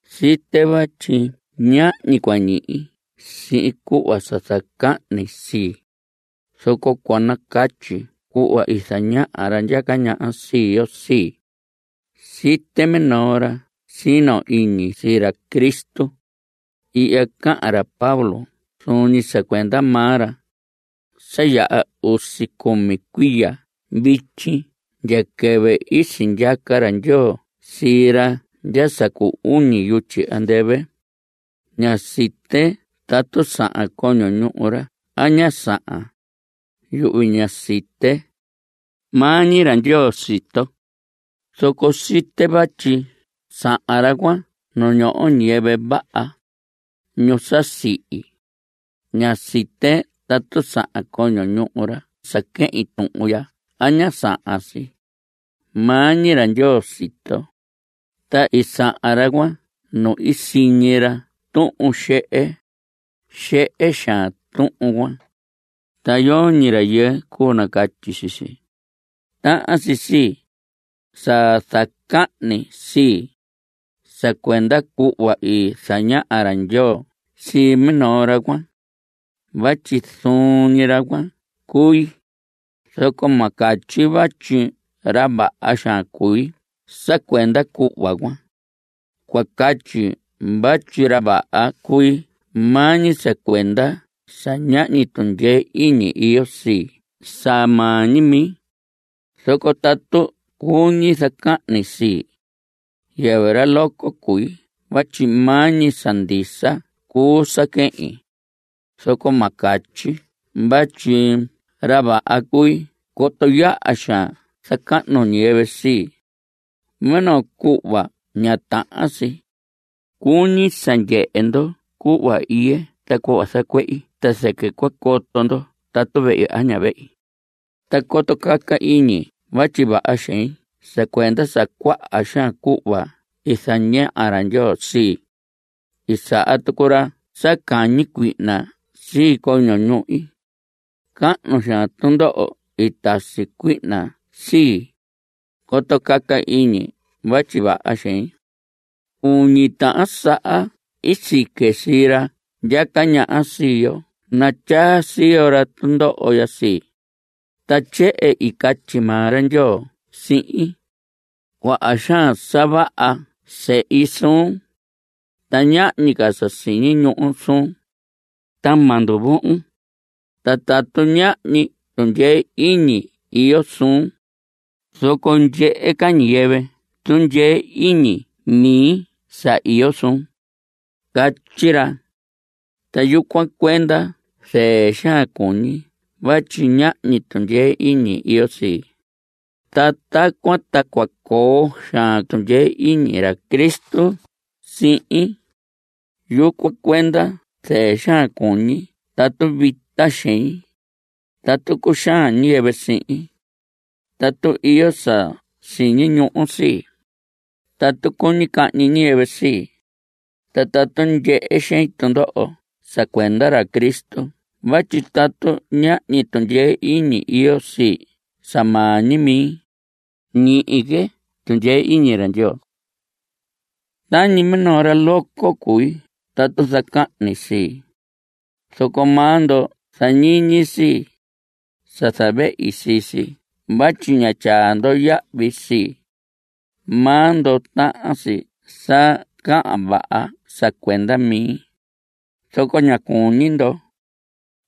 Site vatyi ñahñi cua ñihi sihin cuhva sa zacahni sii, zoco cua nacatyi cuhva i zañaha ra ndyaca ñaha sii yo sii. Site minoo ra sino iñi sii ra Cristo. (Ihya cahan ra Pablo zuun ñi sa cuenda maa ra.) Sa yaha usi cumi cuiya vityi ndya quɨvɨ i sindyaca ra Ndyoo sii ra ndya sa cu uñi yutyi andɨvɨ. Ña site tatu sahan coño ñuhu ra a ña sahan. Yuhvi ña site. Maa ñi ra Ndyoo sito. Zoco site vatyi sahan ra cuan nu ñoho ñiyɨvɨ vaha, ñu sa sihi. Ña site tatu sahan coño ñuhu ra sa quehin tuhun ya a ña sahan si. Maa ñi ra Ndyoo sito. Ta i sahan ra cuan nu i siñi ra tuhun xehe. Xehe xaan tuhun cuan, ta yoñi rayɨɨ cuu nacatyi sii si. Tahan si sii, sa zacahni sii, sa cuenda cuhva i zañaha ra Ndyoo sii minoo ra cuan (vatyi zuun ñi ra cuan cui), zoco ma catyi vatyi ra vaha xaan cui sa cuenda cuhva cuan. Cua catyi vatyi ra vaha cui maa ñi sa cuenda sa ñahñi tundyee iñi iyo sii sa maa ñi mi. Zoco tatu cuñi zacahni sii, yɨvɨ ra loco cui vatyi maa ñi sa ndisa cuu sa quehin. Zoco ma catyi vatyi ra vaha cui coto yaha xaan zacahnu ñiyɨvɨ sii, minoo cuhva ña tahan si. Cuñi sa ndyehe ndo cuhva iye ta cuhva zacuehi ta zɨquɨ cua coto ndo tatu vehi a ña vehi. Ta coto caca iñi vatyi vaha xein sa cuenda sa cuaha xaan cuhva i zañaha ra Ndyoo sii, i saha tucu ra sa cañi cuihna sii coño ñuhi. Cahnu xaan tundoho i tasi cuihna sii, coto caca iñi vatyi vaha xein. Uñi tahan saha i sique sii ra ndyaca ñaha sii yo natyaa siyo ra tundoho ya sii. Ta tyehen i catyi maa ra Ndyoo sihin: “Cuaha xaan sa vaha sehi suun, ta ñahñi ca sa siñi ñuhu suun. Ta ma nduvohon. Ta tatu ñahñi tundyee iñi iyo suun, zoco ndyehe ca ñiyɨvɨ tundyee iñi mi sa iyo suhun”, catyi ra. Ta yucuan cuenda zɨɨ xaan cuñi vatyi ñahñi tundyee iñi iyo sii. Ta tacuan ta cua coo xaan tundyee iñi ra Cristo sihin. Yucuan cuenda zɨɨ xaan cuñi tatu vita xein, tatu cuxaan ñiyɨvɨ sihin, tatu iyo sa siñi ñuhu sii, tatu cuñi cahñi ñiyɨvɨ sii, ta tatu ndyehe xein tundoho sa cuenda ra Cristo vatyi tatu ñahñi tundyee iñi iyo sii sa maa ñi mi, ñihi que tundyee iñi ra Ndyoo. Tañi minoo ra loco cui tatu zacahni sii, zoco maa ndo zañiñi sii, sa zavehi sii si vatyi ña tyaa ndo yahvi sii. Maa ndo tahan si sa cahan vaha sa cuenda mi, zoco ña cuñi ndo.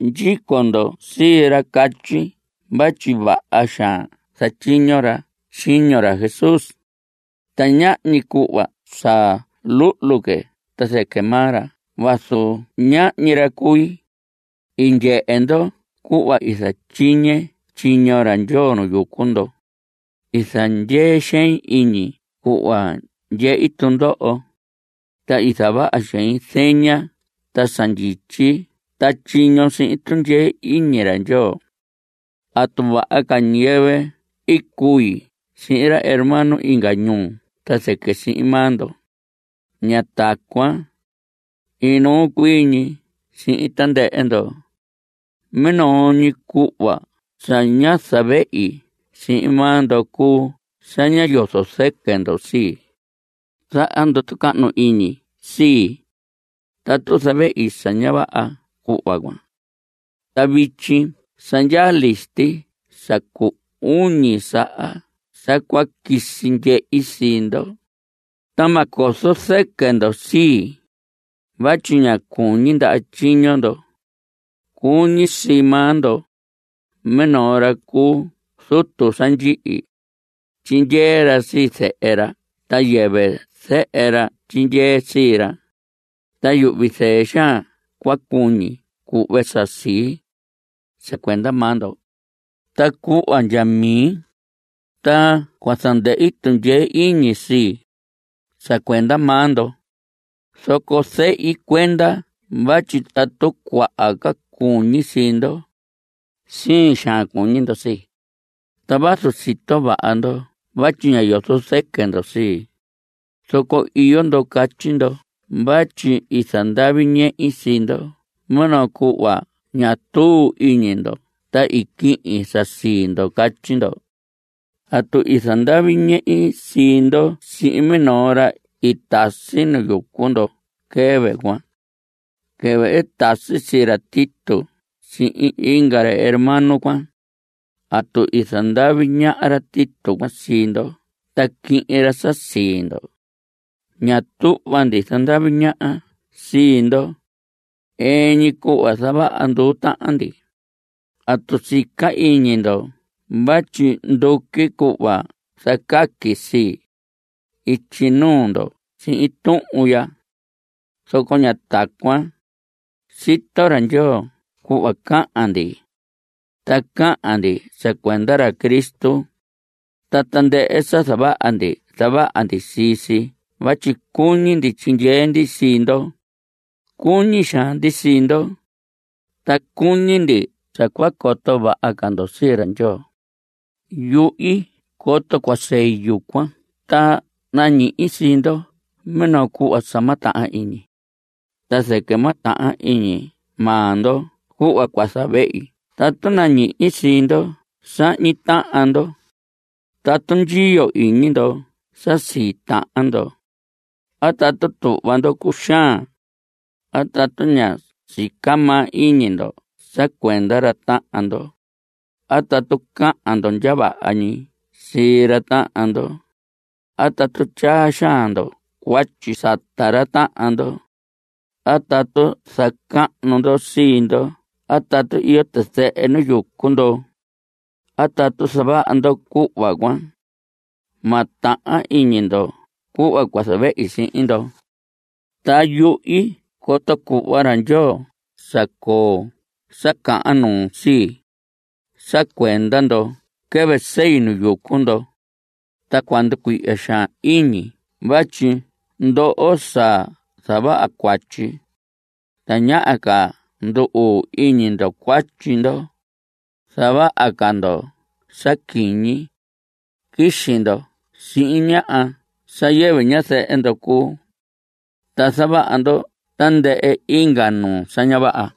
Ndyico ndo sii ra catyi vatyi vaha xaan zatyiño ra tyiño ra Jesús, ta ñahñi cuhva sa luhlu que ta zɨquɨ maa ra vazu ñahñi ra cui. I ndyehe ndo cuhva i zatyiñe tyiño ra Ndyoo nu yucu ndo. I zandyee xein iñi cuhva ndyehi tundoho, ta i zavaha xein zeña ta sa ndyityi ta tyiño sihin tundyee iñi ra Ndyoo. ¿Atu vaha ca ñiyɨvɨ i cui sihin ra hermano inga ñuu ta zɨquɨ sihin maa ndo? Ña tacuan. Inuu ñi cui sihin tandɨhɨ ndo. Minoo ñi cuhva sa ñá zavehi sihin maa ndo cuu sa ñá yozo zɨquɨ ndo sii. Zaha ndo tucahnu iñi sii, tatu zavehi sa ña vaha cuhva cuan. Ta vityi sa ndyaa listi sa cu uñi saha sa cua quisi ndyehi sii ndo. Ta ma cozo zɨquɨ ndo sii, vatyi ña cuñi ndaha tyiño ndo. Cuñi sii maa ndo. Minoo ra cu zutu sa ndyihi, tyindyee ra sii zehe ra ta yɨvɨ zehe ra tyindyee sii ra. Ta yuhvi zɨɨ xaan cua cuñi cuhve sa sii, sa cuenda maa ndo. Ta cuhva ndya mi, ta cua zandɨhi tundyee iñi sii, sa cuenda maa ndo. Zoco zehi cuenda vatyi tatu cuaha ca cuñi sii ndo, siin xaan cuñi ndo sii. Ta vazu sito vaha ndo vatyi ñá yozo zɨquɨ ndo sii, zoco iyo ndo catyi ndo vatyi i zandavi ñehi sii ndo minoo cuhva ñá tuu iñi ndo ta i quihin sa sii ndo. Catyi ndo. ¿Atu i zandavi ñehi sii ndo sihin minoo ra i tasi nu yucu ndo quɨvɨ cuan? Quɨvɨ i tasi sii ra Tito sihin inga ra hermano cuan, ¿atu i zandavi ñaha ra Tito cuan sii ndo ta quihin ra sa sii ndo? Ña tuhva ndi zandavi ñaha sii ndo. Ɨɨn ñi cuhva zavaha nduu tahan ndi. ¿Atu sica iñi ndo vatyi nduqui cuhva zacaqui sii, ityi nuu ndo sihin tuhun ya? Zoco ña tacuan. Sito ra Ndyoo cuhva cahan ndi. Ta cahan ndi sa cuenda ra Cristo. Ta tandɨhɨ sa zavaha ndi, zavaha ndi sii si vatyi cuñi ndi tyindyee ndi sii ndo. Cuñi xaan ndi sii ndo, ta cuñi ndi sa cua coto vaha ca ndo sii ra Ndyoo. Yuhi coto cua sei yucuan ta nañihi sii ndo minoo cuhva sa ma tahan iñi. Ta zɨquɨ ma tahan iñi maa ndo cuhva cua zavehi tatu nañihi sii ndo sahñi tahan ndo, tatu ndyiyo iñi ndo sa sii tahan ndo, a tatu tuhva ndo cuxaan, a tatu ña sica maa iñi ndo sa cuenda ra tahan ndo, a tatu cahan ndo ndya vaha ñi sii ra tahan ndo, a tatu tyaa xaan ndo cuatyi sata ra tahan ndo, a tatu zacahnu ndo sii ndo a tatu iyo tizɨhɨ nu yucu ndo. Tatu zavaha ndo cuhva cuan, ma tahan iñi ndo cuhva cua zavehi sihin ndo. Ta yuhi coto cuhva ra Ndyoo sa coo sa cahan nuu sii, sa cuenda ndo quɨvɨ sei nu yucu ndo. Ta cua nducuihya xaan iñi vatyi ndoho sa zavaha cuatyi, tañaha ca ndu‑uu iñi ndo cuatyi ndo. Zavaha ca ndo sa quiñi. Quixi ndo sihin ñaha sa yɨvɨ ñazɨhɨ ndo cuu, ta zavaha ndo tandɨhɨ inga nuu sa ña vaha.